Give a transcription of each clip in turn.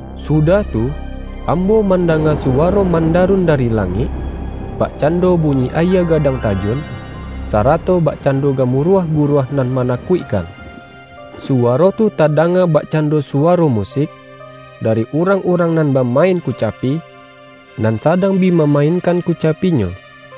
Sudah tu, ambo mandanga suwaro mandarun dari la-ngik, bakcando bunyi ayie gadang ta-jun, sarato bakcando gamuruah gu-ruah nan manakuikkan. Suwaro tu tadanga bakcando suwaro musik, da-ri urang-urang nan bamain kucapi, nan sadang bi mamainkan kucapinyo.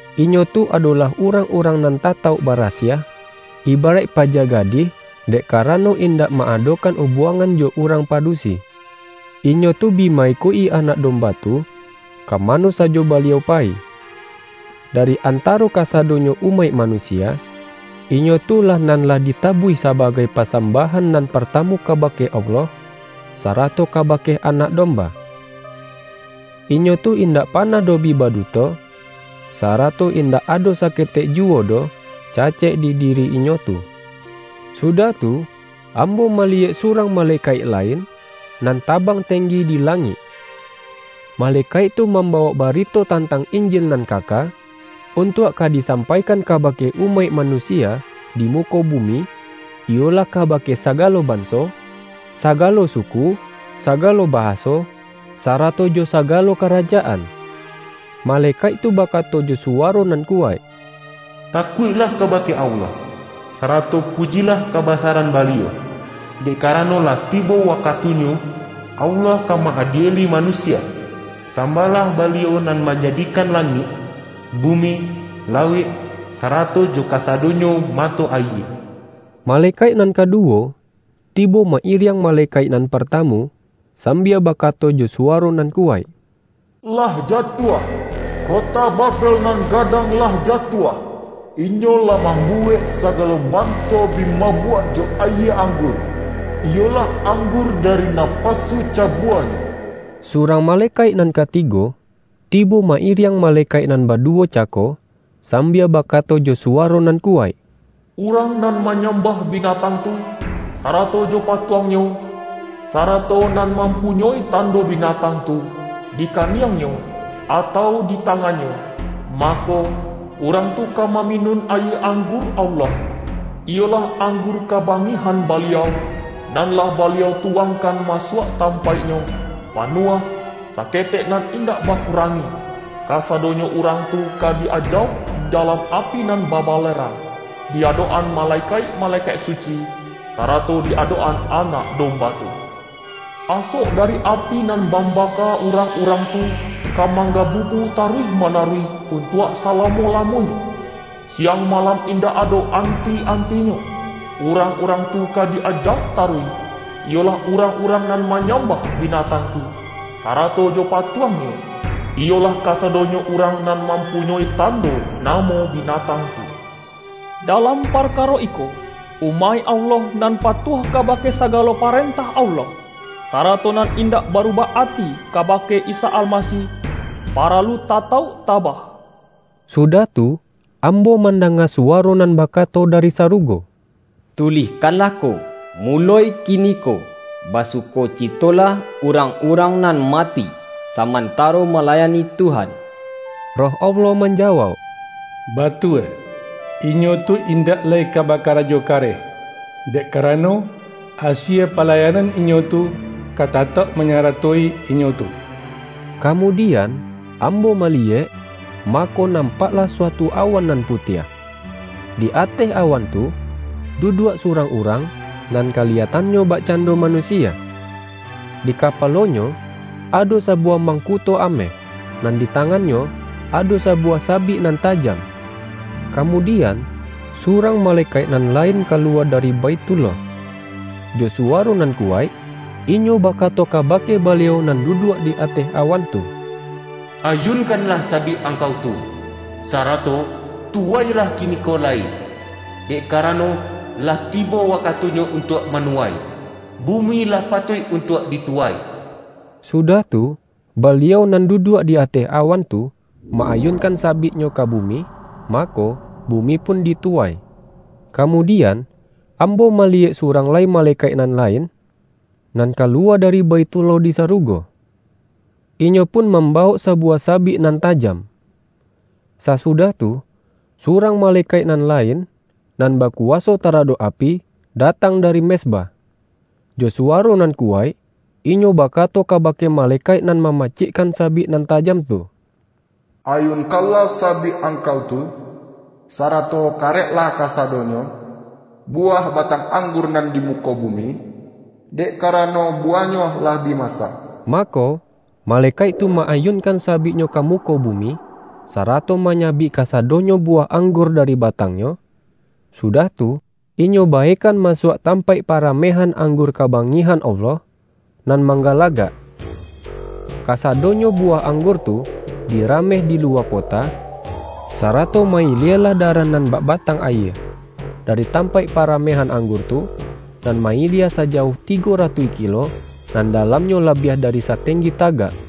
Inyo tu adolah urang-urang nan tatauk barasiah, ibaraik paja ga-dih, dek karano indak ma-adokan ubuangan jo urang padusi. Inyo tu bi ma-ikuik-i Anak Domba tu ka ma-no sajo Baliau payi. Dari antaro ka-sadonyo umaik manusia, inyo tu lah nan lah ditabuih sabagai pasambah-an nan partamu kabake Allah, sarato kabake Anak Domba. Inyo tu indak panah doh bi baduto; sarato indak ado saketek juwo doh cacek di diri inyo tu. Sudah tu, ambo maliyek surang malekaik lain, nan tabang tenggi di langik. Malekaik tu mambawok bari-to tantang Injil nan kaka, untuak ka disampaikan kabake umaik manusia di muko bumi, iyolah kabake saga-lo banso, sagalo suku, sagalo bahaso, sarato jo sagalo karajaan. Malekaik tu bakato jo suwaro nan kuwaik,”Ta-kuiklah kabake Allah, sarato pujilah kabasaran Baliau! Dek karano lah tibo wakatunyo, Allah ka ma-adieli manu-sia. Sambahlah Baliau nan manjadi-kan langik, bumi, lauik, sarato jo ka-sadonyo mato ayie!” Malekaik nan kaduwo, tibo ma-iriang malekaik nan partamu, sambia bakato jo suwaro nan kuwaik,”Lah jatuah! Kota Babel nan gadang lah ja-tuah! Inyo lah mambuwek sagalo ban-so bi mabuak jo ayie anggur iyolah anggur dari napasu cabuanyo!” Surang malekaik nan katigo, ti-bo ma-iriang malekaik nan baduwo cako, sambia bakato jo suwaro nan kuwaik,”Urang nan manyambah bi-natang tu, sarato jo patuangnyo, sa-rato nan mampunyoi tando binatang tu, di kaniangnyo, atau di tangan-nyo, mako, urang tu ka maminun ayie anggur Allah, iyolah anggur ka-bangihan Baliau, nan lah Baliau tu-wangkan masuak tampaiknyo, pa-nuah, saketek nan indak bakurangi! Kasadonyo urang tu ka di-ajauk di dalam api nan babalerang, di adok-an malekaik-malekaik suci, sarato di adok-an Anak Domba tu. Asok da-ri api nan mambaka urang-urang tu, ka manggabubu taruih manaruih un-tuak salamo-lamonyo. Siang malam indak ado anti-antinyo, urang-urang tu ka di-ajauk taruih, iyolah urang-urang nan manyambah binatang tu, sarato jo patuangnyo, iyolah kasado-nyo urang nan mampunyoi tando na-mo binatang tu.” Dalam parkaro iko, umaik Allah nan patuah kabake sagalo parentah Allah, sarato nan indak barubah ati kabake Isa Almasih, paralu tatauk ta-bah. Sudah tu, ambo mandanga suwa-ro nan bakato dari sarugo,”Tulihkanlah ko: Muloi kiniko, basukocitolah urang-urang nan mati samantaro ma-layani Tuhan!” Roh Allah manjawauk,”Batua! Inyo tu indak lai ka bakarajo kareh, dek karano, asie palayanan inyo tu, ka ta-tauk manyaratoi inyo tu.” Kamudian, ambo maliyek, mako nampaklah suatu awan nan putiah. Di ateh awan tu, duduak surang Urang, nan kaliyatannyo bakcando Manusia. Di kapalo-Nyo ado sabuwah mangku-to ameh, nan di tangan-Nyo ado sa-buwah sabik nan tajam. Kamudian, surang malekaik nan lain kaluwa da-ri Baithullah. Jo suwaro nan kuwaik, inyo bakato kabake Baliau nan du-duak di ateh awan tu,”Ayunkanlah sabik Angkau tu, sarato tuwailah ki-niko lai, dek karano lah tibo wakatu-nyo untuak manuwai; bumi lah pa-tuik untuak dituwai!” Sudah tu, Baliau nan duduak di ateh awan tu ma-ayunkan sabik-Nyo ka bumi, ma-ko, bumi pun dituwai. Kamudian, ambo maliyek su-rang lai malekaik nan lain, nan ka-luwa dari Baithullah di sarugo. Inyo pun mambawok sabuwah sabik nan tajam. Sasudah tu, surang malekaik nan lain, nan bakuwaso taradok api, datang dari mezbah. Jo suwaro nan kuwaik, inyo bakato kabake malekaik nan mamacikkan sabik nan tajam tu,”Ayunkanlah sabik angkau tu, sara-to kareklah kasadonyo buwah batang anggur nan di muko bumi, dek kara-no buwahnyo lah bi masak!” Ma-ko, malekaik tu ma-ayunkan sabiknyo ka muko bumi, sarato manyabik kasa-donyo buwah anggur dari batangnyo, sudah tu, inyo baekan masuak tam-paik paramehan anggur kabangihan Allah, nan manggalagak. Kasado-nyo buwah anggur tu dirameh di lu-wa kota, sarato ma-ilielah darah nan bak batang ayie, dari tampaik para-mehan anggur tu, nan ma-ilie sajauah tigo ratuih kilo, nan dalamnyo labiah dari satenggi tagak.